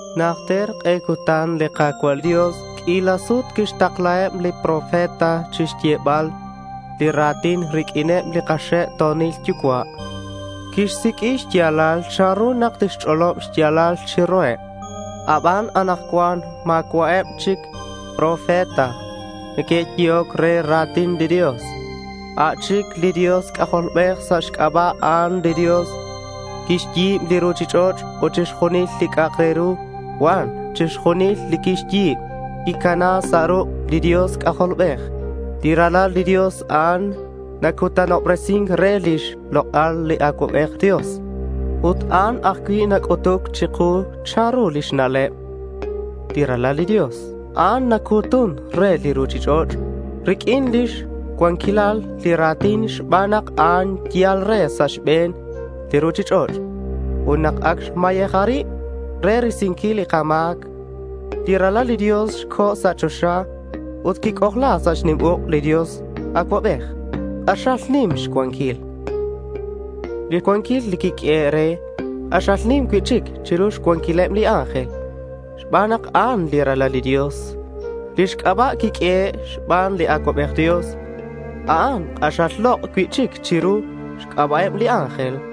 Najter k'e cutan li Ka̱cua' Dios q'uila sut quixtaklaheb chak li profeta chixyebal li ra̱tin riq'uineb li kaxe'to̱nil yucua'. Quixsiq'ui xya̱lal chanru nak tixch'olob xya̱lal chiruheb. Aban anakcuan ma̱cua'eb chic li profeta neque'yehoc re li ra̱tin li Dios. A' chic li Dios C'ajolbej. Sa' xc'aba' a'an, li Dios quixyi̱b li ruchich'och' ut chixjunil li c'a'ak re ru cuan. Chixjunil li quixyi̱b quicana sa' ruk' li Dios C'ajolbej. Li Ralal li Dios, a'an nacutanobresin re lix lok'al li Acuabej Dios. Ut a'an ajcui' nac'utuc chiku chanru lix na'leb. Li Ralal li Dios, a'an nacu̱tun re li ruchich'och' riq'uin lix cuanquilal li ra̱tin xban nak a'an yal re sa' xbe̱n li ruchich'och'. Ut nak ac xmayeja rib re risinquil li kama̱c, li Ralal li Dios co̱ sa' choxa ut quic'ojla sa' xnim uk' li Dios Acuabej, li k'axal nim xcuanquil. Li cuanquil quiq'uehe' re k'axal nim cui'chic chiru xcuanquileb li ángel xban nak a'an li Ralal li Dios. Lix c'aba' quiq'uehe' xban li Acuabej Dios, a'an k'axal lok' cui'chic chiru lix c'aba'eb li ángel.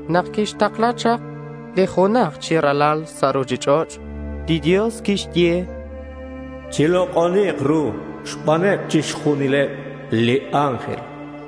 Nak quixtakla chak li junaj chi Ralal sa' ruchich'och', li Dios quixye: Chilok'oni̱k ru xbaneb chixjunileb li ángel.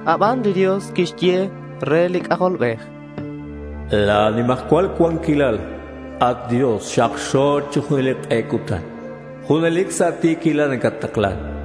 Aban li Dios quixye re li C'ajolbej: La̱ nimajcual cuanquilal, at Dios, xakxo̱k chi junelic k'e cutan. Junelic sa' ti̱quilal nacattaklan.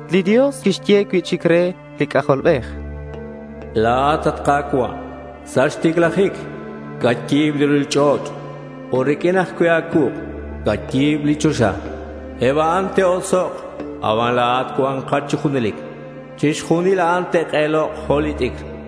Li Dios quixye cui'chic re li C'ajolbej: La̱at, at Ka̱cua', sa' xticlajic cayi̱b li ruchich'och' ut riq'uin ajcui' a̱cuuk' cayi̱b li choxa. Eb a'an te'osok' aban la̱at cua̱nkat chi junelic. Chixjunil a'an te'k'elok' jo' li t'icr.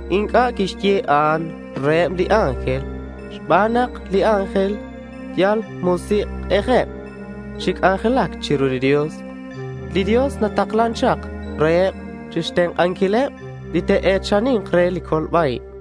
Inc'a' quixye a'an reheb li ángel xban nak li ángel yal musik'ejeb chi c'anjelac chiru li Dios. Li Dios nataklan chak reheb chixtenk'anquileb li te'e̱chani̱nk re li colba-ib.